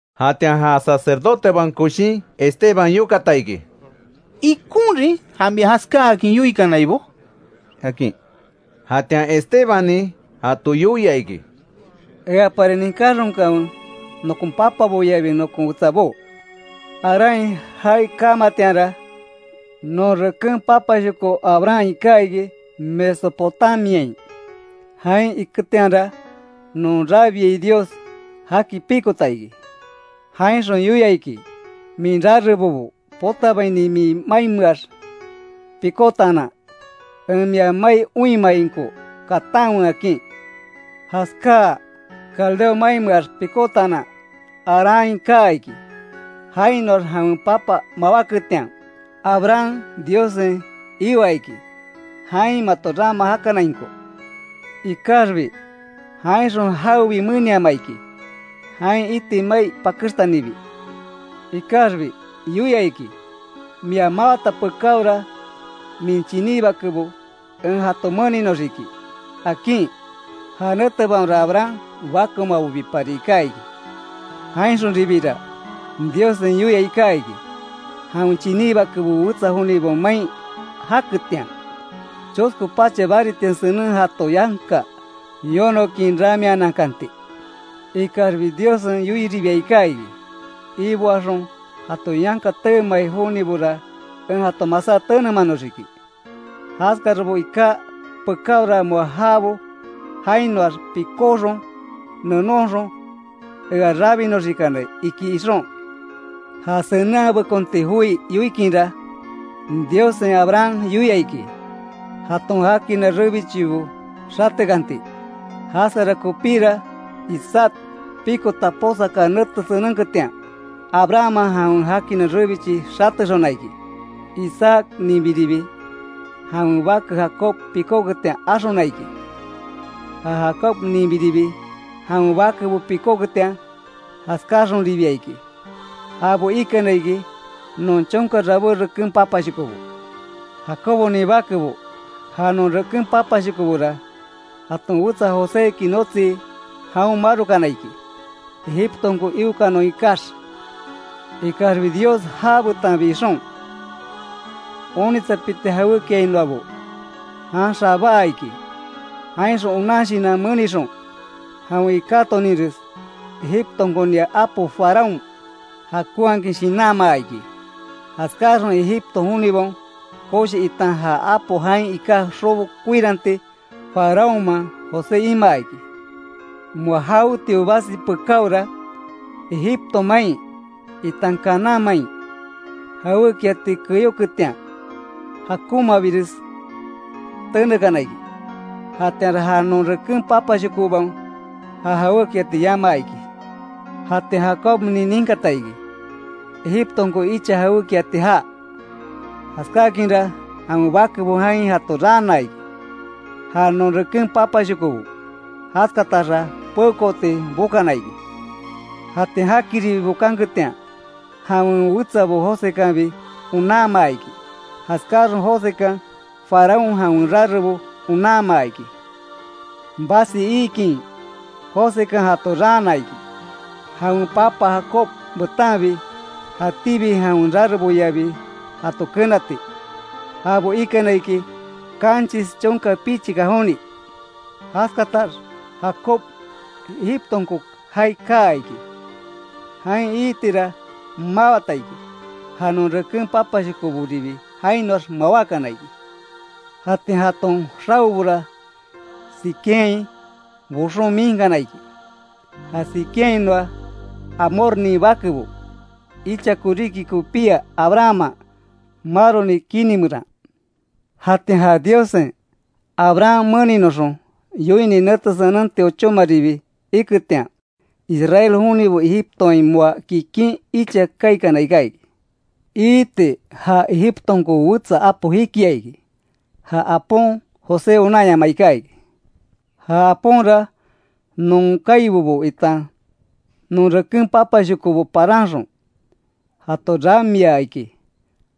Jatian ja sacerdotebaon koshin Esteban yokata iki: —¿Ikonrin ja mia jaskaakin yoikanaibó? —akin. Jatian Estebannin jato yoia iki: “Eapari ninkáxonkanwe, nokon papaboyabi nokon wetsabó. Haránhain jaai kamatianra, non reken papashoko Abraham iká iki Mesopotamiain. Jain iketianra, non rabiai Dios jaki pikota iki. Jainxon yoia iki: ‘Min rarebobo potabaini min mainmeax pikótaanan, en mia mai oinmainko katanwe’, akin. Jaskáa, Caldeo mainmeax pikótaanan Haránhain kaa iki. Jainoax jawen papa mawáketian, Abraham Diossen ioa iki, jain mato rama jakanainko. Ikaxbi jainxon jawebi meniamaa iki, jain iti mai pakextanibi. Ikaxbi yoia iki, mia mawata pekáora, min chiní bakebo en jato meninoxiki, akin. (Ja netebaonra Abraham bakeomabobipari iká iki.) Jainxonribira Diossen yoia iká iki, jawen chiní bakebo wetsa jonibaon main jaketian, chosko pacha baritia senen jato yanka yonokin ramianaankanti. Ikaxbi Diossen yoiribia iká iki: ‘Iboaxon jato yanka teemai jonibora en jato masá tenemanoxiki. Jaskarabo iká pekaora moa jabo jainoax pikóxon, nenonxon ea rabinonxikanai’, iki xon. Ja senenhabekonti joi yoikinra, Diossen Abraham yoia iki, jaton jakina rebichibo xatekanti. Jaskara kopíra, Isaac pikota posaka nete senenketian, Abrahamman jawen jakina rebichi xatexona iki. Isaacninbiribi jawen bake Jacob pikóketian axona iki, ja Jacobninbiribi, jawen bakebo pikóketian jaskáaxonribia iki. Jabo ikana iki, non chonka rabé reken papashokobo. Jacobonin bakebo ja, non reken papashokobora, jaton wetsa Joséki notsii, jaon marokana iki, Egiptonko iokanon ikax. Ikaxbi Dios já betanbi ixon, onitsapiti jawékiainoabo, jan xabaa iki. Jainxon onan shinan menixon, jawen ikátoninres Egiptonkonia apo Faraón jakonhakin shinanmaa iki. Jaskáaxon Egipto jonibaon koshi, itan ja apo jain iká xobo koiranti, Faraónman, José imaa iki. Moa jawetio basi pekáora, Egipto main, itan Canaán main, jawékiati keyóketian jakonmabires tenekana iki, jatianra ja non reken papashokobaon ja jawékiati yamaa iki. Jatian Jacobnin ninkata iki, Egiptonko icha jawékiati jaa. Jaskáakinra, jawen bakebo jain jato raana iki, ja non reken papashokobo. Jaskataxa peokooti bokana iki. Jatian jakiribi bokanketian, jawen wetsabo Josekanbi onanmaa iki. Jaskáaxon Josekan, Faraón jawen rarebo onanmaa iki. Basi iikin Josekan jato raana iki, jawen papa Jacob betanbi, jatíbi jawen rareboyabi jato kenati. Jabo ikana iki, kanchis chonka pichika joni. Jaskatax, Jacob Egiptonko jaai kaa iki. Jain iitira mawata iki. Ja non reken papashokoboribi jainoax mawákana iki. Jatian jaton xaobora, Siquemhain boxon miinkana iki, ja Siquemhainoa Hamornin bakebo, icha koríki kopía Abrahamman maroni kini meran. Jatian ja Diossen, Abraham meninoxon yoini nete senenti ochómaribi iketian, Israel jonibo Egiptoain moa kikin icha kaikana iká iki. Iiti ja Egiptonko wetsa apo jikia iki. Ja apon José onanyamaa iká iki. Ja aponra non kaibobo, itan non reken papashokobo paranxon, jato ramiaa iki,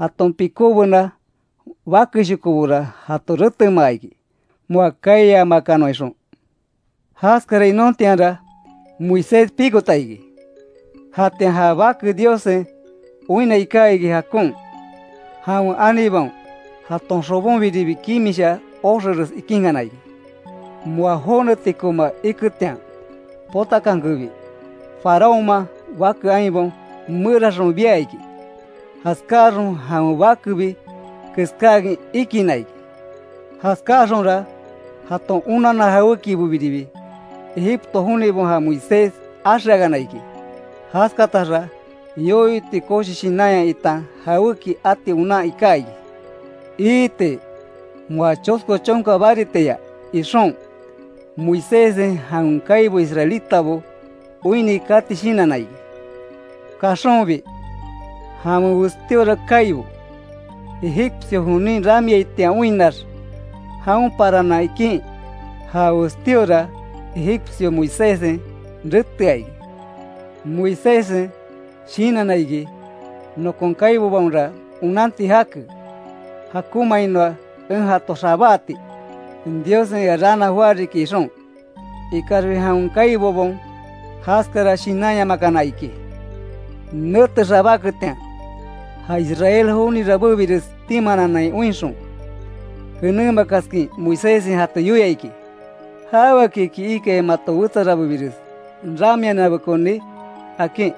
jaton pikóbena bakeshokobora jato retemaa iki, moa kaiyamakanon ixon. Jaskara inontianra, Moisés pikota iki. Jatian ja bake Diossen oinna iká iki jakon. Jawen anibaon jaton xobonbiribi kimisha oxeres ikínkana iki. Moa jónetikoma iketian potakankebi, Faraónman bake ainbaon meraxon bia iki. Jaskáaxon jawen bakebi keskáakin ikinna iki. Jaskáaxonra jaton onanna jawékibobiribi, Egipto jonibaon ja Moisés axeakana iki; jaskataxa yoyo iti koshi shinanya itan jawéki ati onan iká iki. Iiti, moa chosko chonka baritiaya ixon, Moiséssen jawen kaibo israelitabo oinni kati shinanna iki. Kaxonbi, jawen westíora kaibo, egipcio jonin ramiaitian oinnax jaon parana ikin, ja westíora egipcio Moiséssen retea iki. Moiséssen shinanna iki; nokon kaibobaonra onanti jake, jakonmainoa en jato xabáati, Diossen ea raana joá riki ixon. Ikaxbi jawen kaibobaon jaskara shinanyamakana iki. Nete xabáketian, ja Israel joni rabébires timaananai oinxon, jenémakaskin Moiséssen jato yoia iki; ‘¿Jaweakiki ikai mato wetsa rabébires ramiananbekoni?’ akin.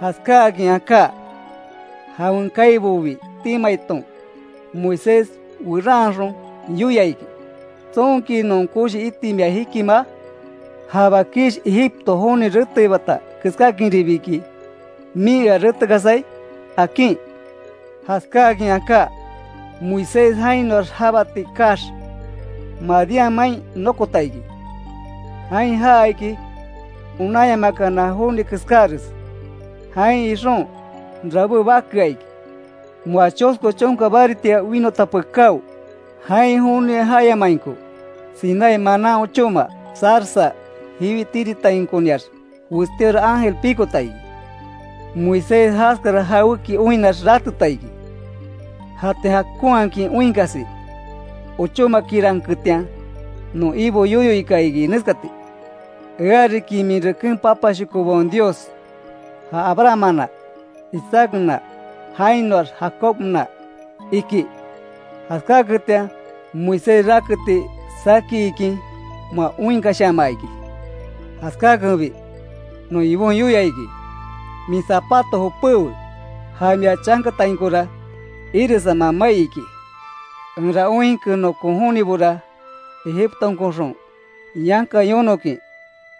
Jaskáakin aká, jawen kaibobi timaiton, Moisés weranxon yoia iki: ‘¿Tsonki non koshi iti mia jikimaa? ¿Ja bakish Egipto joni reteibata keskáakinribiki min ea retekasai?’ akin. Jaskáakin aká, Moisés jainoax jabati kaax, Madián main nokota iki. Jain jaa iki onanyamakana joni keskares. Jain ixon, rabé bakea iki. Moa chosko chonka baritia winota pekáo, jain joni jayamainko, Sinaí manan ochóma, zarza jiwi tiritainkoniax, westíora ángel pikota iki. Moisés jaskara jawéki oinnax rateta iki. Jatian jakonhakin oinkasi ochómakiranketian, non Ibo yoyo ika iki neskati: ‘Eariki min reken papashokobaon Dios; ja Abrahammana, Isaacna, jainoax Jacobna’, iki. Jaskáketian Moisés raketi saki ikin, moa oinkashamaa iki. Jaskakenbi, non Ibon yoia iki: ‘Min zapato jopéwe, ja mia chankatainkora iresama mai iki. Enra oinke nokon jonibora, Egiptonkoxon yanka yonokin,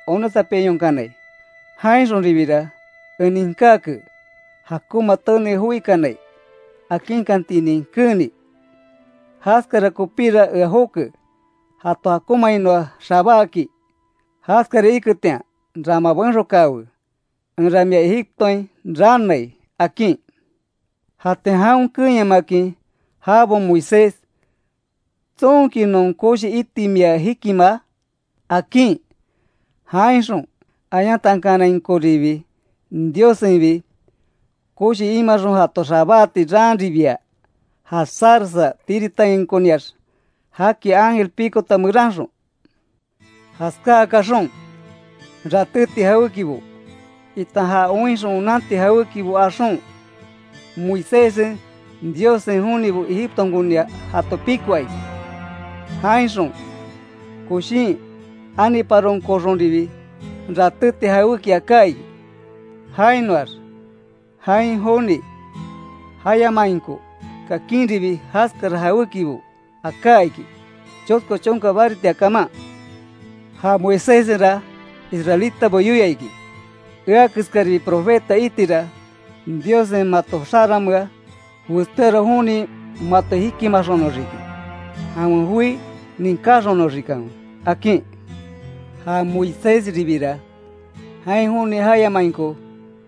onitsapiayonkanai. Jainxoribira en ninkáke, jakonma tenei joikanai, akinkantinin keeni. Jaskara kopíra ea joke jato jakonmainoa xabáaki. Jaskara iketian rama benxokaawe, enra mia Egiptoain raanai’, akin. Jatian jaon keenyamakin jabaon Moisés: ‘¿Tsonki non koshi iti mia jikimaa?’ akin, jainxon ayantankanainkoribi Diossenbi, koshi imaxon jato xabáati raanribia, ja zarza tiritainkoniax jaki ángel pikota meranxon. Jaskaa kaxon, ratéti jawékibo, itan ja oinxon onanti jawékibo axon, Moiséssen, Diossen jonibo Egiptonkonia jato pikoa iki. Jainxon, Joshin aniparonkoxonribi ratéti jawéki aká iki. Jainoax jain joni jayamainko kakinribi jaskara jawékibo aká iki, chosko chonka baritia kaman. Ja Moiséssenra israelitabo yoia iki: ‘Ea keskaribi profeta itira, Diossen mato xaranmea, westíora joni mato jikimaxonoxiki, jawen joi ninkáxonoxikanwe’, akin. Ja Moisésribira, jain joni jayamainko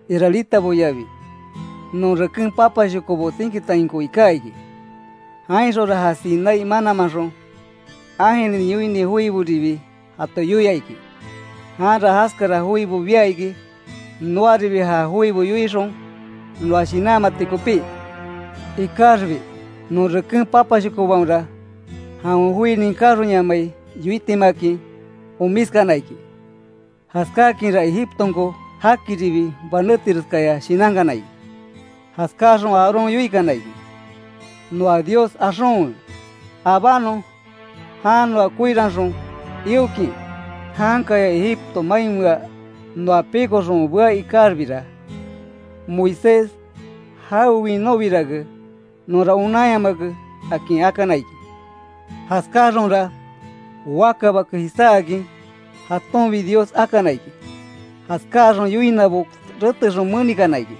israelitaboyabi, non reken papashokobo tsinkitainko iká iki. Jainxonra ja Sinaí mananmanxon, ángelnin yoini joiboribi jato yoia iki. Janra jaskara joibo bia iki, noaribi ja joibo yoixon, noa shinanmati kopí. Ikaxbi non reken papashokobaonra, jawen joi ninkáxonyamai, yoitimakin omiskana iki; jaskákinra Egiptonko jakiribi banétireskaya shinankana iki. Jaskáaxon Aarón yoikana iki: ‘Noa dios axonwe, abánon jan noa koiranxon iokin. Jankaya Egipto mainmea noa pikoxon bea ikaxbira, Moisés jawe winóbirake, nonra onanyamake’, akin akana iki. Jaskáaxonra, waka bake jisáakin, jatonbi dios akana iki. Jaskáaxon yoinabo retexon menikana iki.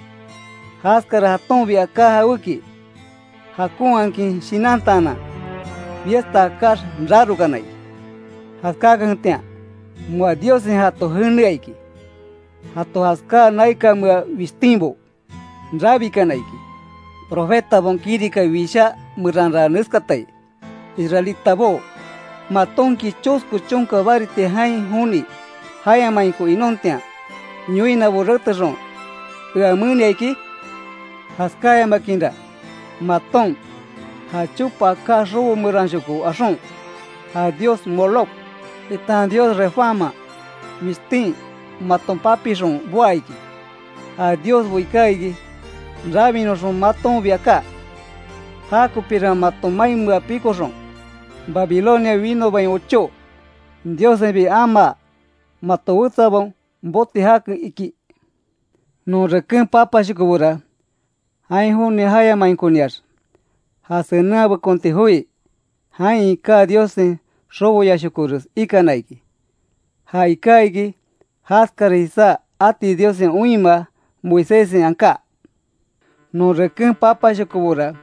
Jaskara jatonbi aká jawéki, jakonhakin shinantaanan, fiesta akáx rarokana iki. Jaskákanketian, moa Diossen jato jenea iki. Jato jaskáa naikanmea wistínbo rabikana iki. Profetabaon kirika wishá meranra neskatai: ‘Israelitabó ¿Matonki chosko chonka baritia jain joni jayamainko inontian, yoinabo retexon ea menia iki? Jaskáyamakinra, maton, ja chopa aká xobo meranshoko axon, ja dios Moloc, itan dios Refánman wishtin maton papixon boá iki. Ja diosbo iká iki, rabinoxon matonbi aká. Jakopira maton mainmea pikoxon, Babilonia winobain ochó, Diossenbi amaa, mato wetsabaon boti jake’, iki. Non reken papashokobora, jain joni jayamainkoniax, ja senenhabekonti joi jain iká Diossen xoboyashokores ikana iki. Ja iká iki, jaskara jisá ati Diossen oinmaa, Moiséssen aká. Non reken papashokobora,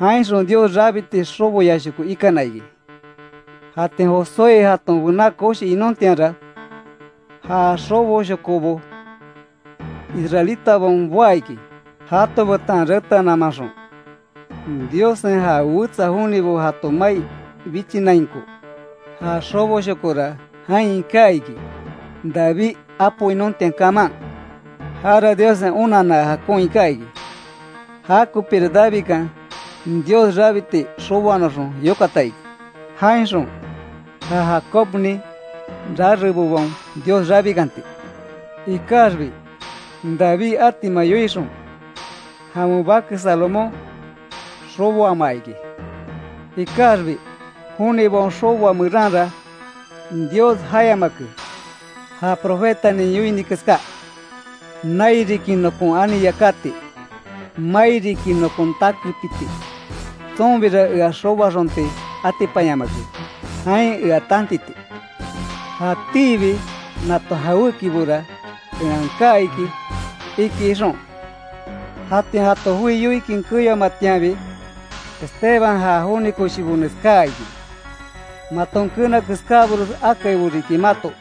jainxon Dios rabiti xoboyashoko ikana iki. Jatian Josué jaton bená koshi inontianra, ja xoboshoboko Israelitabaon boá iki, jato betan reteanamaxon, Diossen ja wetsa jonibo jato mai bichinainko. Ja xoboshokora jain iká iki, David apo inontian kaman. Jara Diossen onanna jakon iká iki. Jakopira Davidkan, Dios rabiti xoboanoxon yokata iki, jainxon ja Jacobnin rarebobaon Dios rabikanti. Ikaxbi David atima yoixon, jawen bake Salomón xoboamaa iki. Ikaxbi jonibaon xoboa meranra, Dios jayamake. Ja profetanin yoini keská: ‘Nai riki nokon ani yakati; mai riki, nokon takepiti. Tsonbira ea xoboaxonti atipanyamake, jain ea tantiti. Jatíbi nato jawékibora en aká iki’, iki xon. Jatian jato joi yoikin keyoamatianbi, Esteban ja joni koshibo neskáa iki: ¡Maton keena keskábores akaibo riki mato!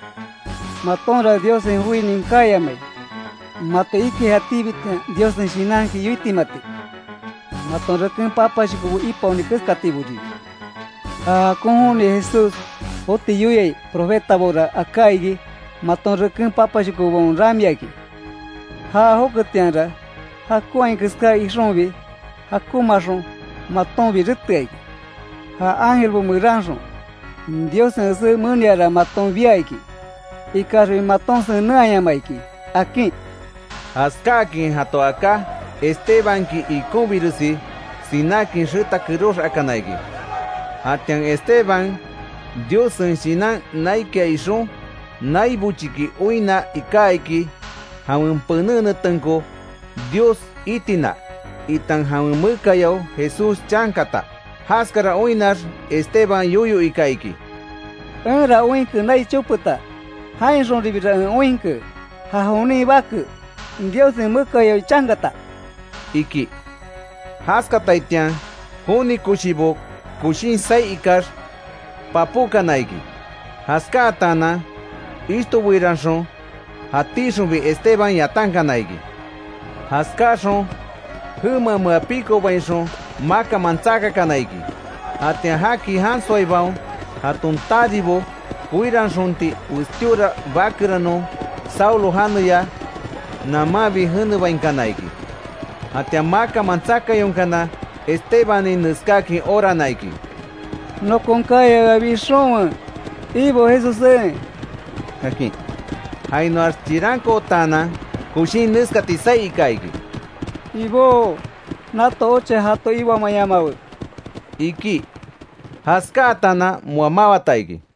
¡Matonra Diossen joi ninkáyamai! Mato ikai jatíbitian Diossen Shinanki yoitimati. Maton reken papashokobo ipaoni keskatiboribi. Ja jakon Joni Jesús joti yoiai profetabora aká iki, maton reken papashokobaon ramiakin. Já joketianra, jakonhai keská ixonbi jakonmaaxon, matonbi retea iki. Ja ángelbo meranxon, Diossen esé meniara maton bia iki. Ikaxbi maton senenhayamaa iki”, akin. Jaskáakin jato aká, Estebanki ikonbiresi sinákin, xeta kerox akana iki. Jatian Esteban, Diossen Shinan naikia ixon, nai bochiki oinna iká iki, jawen pené netenko Dios itina, itan Jawen mekayao Jesús chankata. Jaskara oinnax, Esteban yoyo ika iki: —¡Enra oinke nai chopeta. Jainxonribira en oinke, ja jonin Bake, Diossen mekayao chankata! —iki. Jaskataitian, joni koshibo koshin saí ikax, papókana iki. Jaskataanan ishtobeiranxon, jatíxonbi Esteban yatankana iki. Jaskáaxon, jemamea pikobainxon, makanman tsakakana iki. Jatian jaki jansoaibaon, jaton taribo, koiranxonti westíora bakeranon, Saulo janeya namanbi jenebainkana iki. Jatian makanman tsakayonkana, Estebannin neskáakin orana iki: “Nokon kaya ea bixonwe, Ibo Jesussé”, akin. Jainoax chirankootaanan, koshín neskati saí ika iki: “¡Ibó, nato ocha jato iboamayamawe!” iki. Jaskátaanan, moa mawata iki.